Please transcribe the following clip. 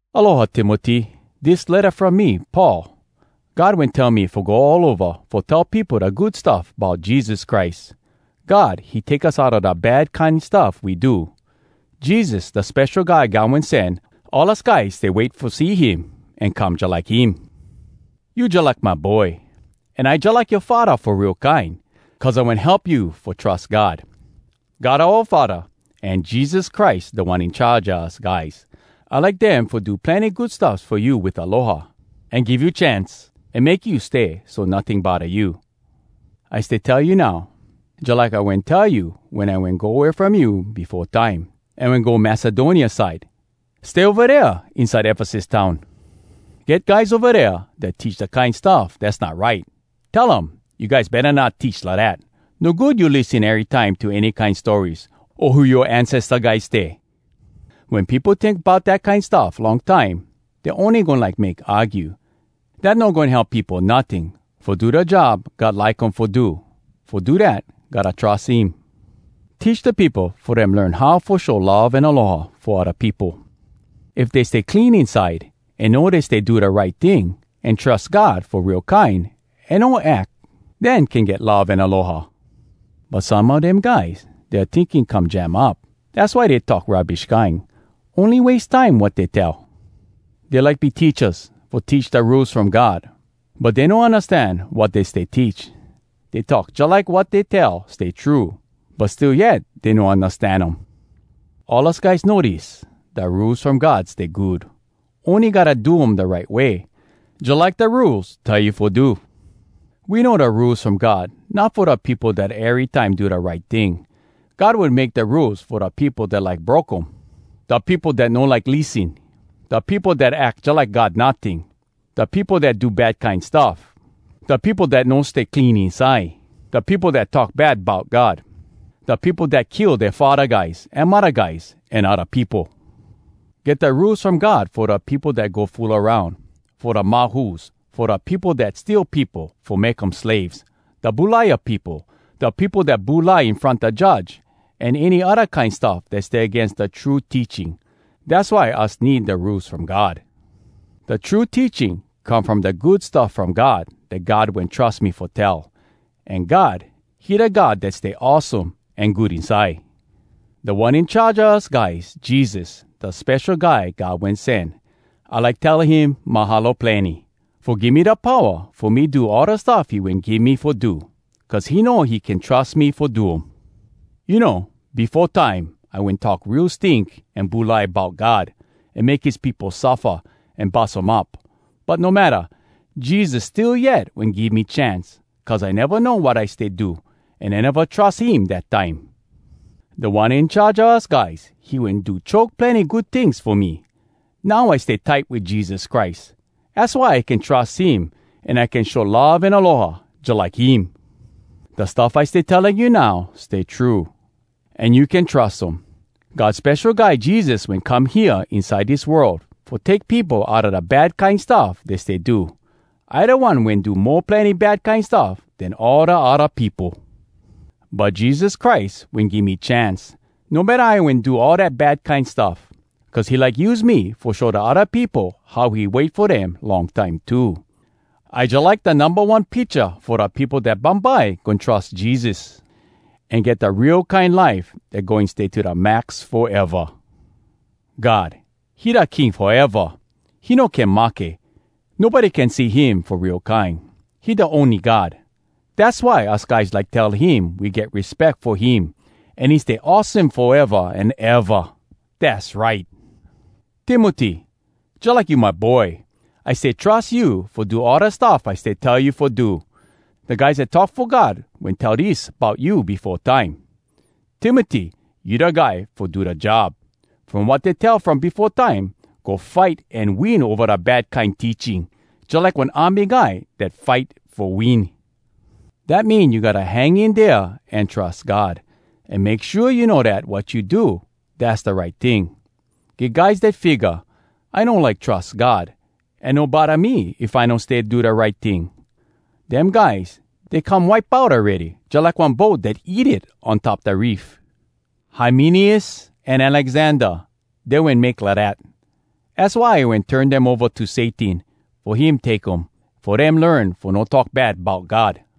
Aloha, Timoty! Dis letta from me, Paul. God wen tell me fo go all ova fo tell peopo da Good Stuff Bout Jesus Christ. God, he take us outa da bad kine stuff we do. Jesus, da Spesho Guy God Wen Sen, all us guys stay wait fo see him an come jalike him. You jalike my boy, an I jalike yoa faddah, fo real kine, cuz I wen help you fo trus God. God oua Faddah, an Jesus Christ Da One In Charge a us guys, I like dem fo do plenny good stuffs fo you wit aloha, an give you chance, an make you stay so notting bodda you. I stay tell you now, jalike I wen tell you wen I wen go way from you befo time, an wen go Macedonia side: Stay ova dea inside Efesus town. Get guys ova dea dat teach da kine stuff dass not right. Tell um, “You guys betta not teach lidat! No good you lissen erytime to any kine stories, o who yoa ancesta guys stay.” Wen peopo tink bout dat kine stuff long time, dey ony goin like make argue. Dat no goin help peopo notting fo do da job God like um fo do. Fo do dat, gotta trus him. Teach da peopo fo dem learn how fo show love an aloha fo odda peopo. If dey stay clean inside, an know dey stay do da right ting, an trus God fo real kine an no ack, den can get love an aloha. But some a dem guys, dea tinking come jam up. Dass why dey talk rubbish kine. Ony wase time wat dey tell. Dey like be teachas, fo teach da Rules From God, but dey no undastan wat dey stay teach. Dey talk jalike wat dey tell stay true, but still yet dey no undastan um. All us guys know dis: da Rules From God stay good! Ony gotta do um da right way, jalike da Rules tell you fo do. We know da Rules From God not fo da peopo dat erytime do da right ting. God wen make da Rules fo da peopo dat like broke um, da peopo dat no like lissen, da peopo dat ack jalike God notting, da peopo dat do bad kine stuff, da peopo dat no stay clean inside, da peopo dat talk bad bout God, da peopo dat kill dea faddah guys an muddah guys an odda peopo. Get da Rules From God fo da peopo dat go fool aroun, fo da mahus, fo da peopo dat steal peopo fo make um slaves, da bulaia peopo, da peopo dat bulai in front da judge, an any odda kine stuff dat stay agains da true teaching. Dass why us need da Rules From God. Da true teaching come from da Good Stuff From God dat God wen trus me fo tell. An God, he da God dat stay awesome an good inside. Da One In Charge a us guys, Jesus, da Spesho Guy God Wen Sen, I like tell him “Mahalo plenny!” fo give me da powa fo me do all da stuff he wen give me fo do. Cuz he know he can trus me fo do um. You know, befo time I wen talk real stink an bulai bout God, an make his peopo suffa, an bus um up. But no matta, Jesus still yet wen give me chance, cuz I neva know wat I stay do, an I neva trus him dat time. Da One In Charge a us guys, he wen do choke plenny good tings fo me. Now I stay tight wit Jesus Christ. Az why I can trus him, an I can show love an aloha jalike him. Da stuff I stay telling you now stay true, an you can trus um: God Spesho Guy Jesus wen come hea inside dis world, fo take peopo outa da bad kine stuff dey stay do. I da one wen do mo plenny bad kine stuff den all da odda peopo. But Jesus Christ wen give me chance, no matta I wen do all dat bad kine stuff. Cuz he like use me fo show da odda peopo how he wait fo dem long time too. I jalike da numba one picha fo da peopo dat bumbye goin trus Jesus, an get da real kine life dat goin stay to da max foeva! God, he da King foeva. He no can mahke. Nobody can see him fo real kine. He da ony God. Dass why us guys like tell him we get respeck fo him, an he stay awesome foeva an eva. Dass right! Timoty, jalike you my boy! I stay trus you fo do all da stuff I stay tell you fo do. Da guys dat talk fo God wen tell dis bout you befo time: “Timoty, you da guy fo do da job.” From wat dey tell from befo time, go fight an win ova da bad kine teaching, jalike one army guy dat fight fo win. Dat mean you gotta hang in dea an trus God, an make shua you know dat wat you do, dass da right ting. Get guys dat figga, “I no like trus God, an no bodda me if I no stay do da right ting!” Dem guys, dey come wipe out awready, jalike one boat dat eat it on top da reef. Hymeneus an Alexander, dey wen make lidat. Az why I wen turn dem ova to Satan fo him take um, fo dem learn fo no talk bad bout God.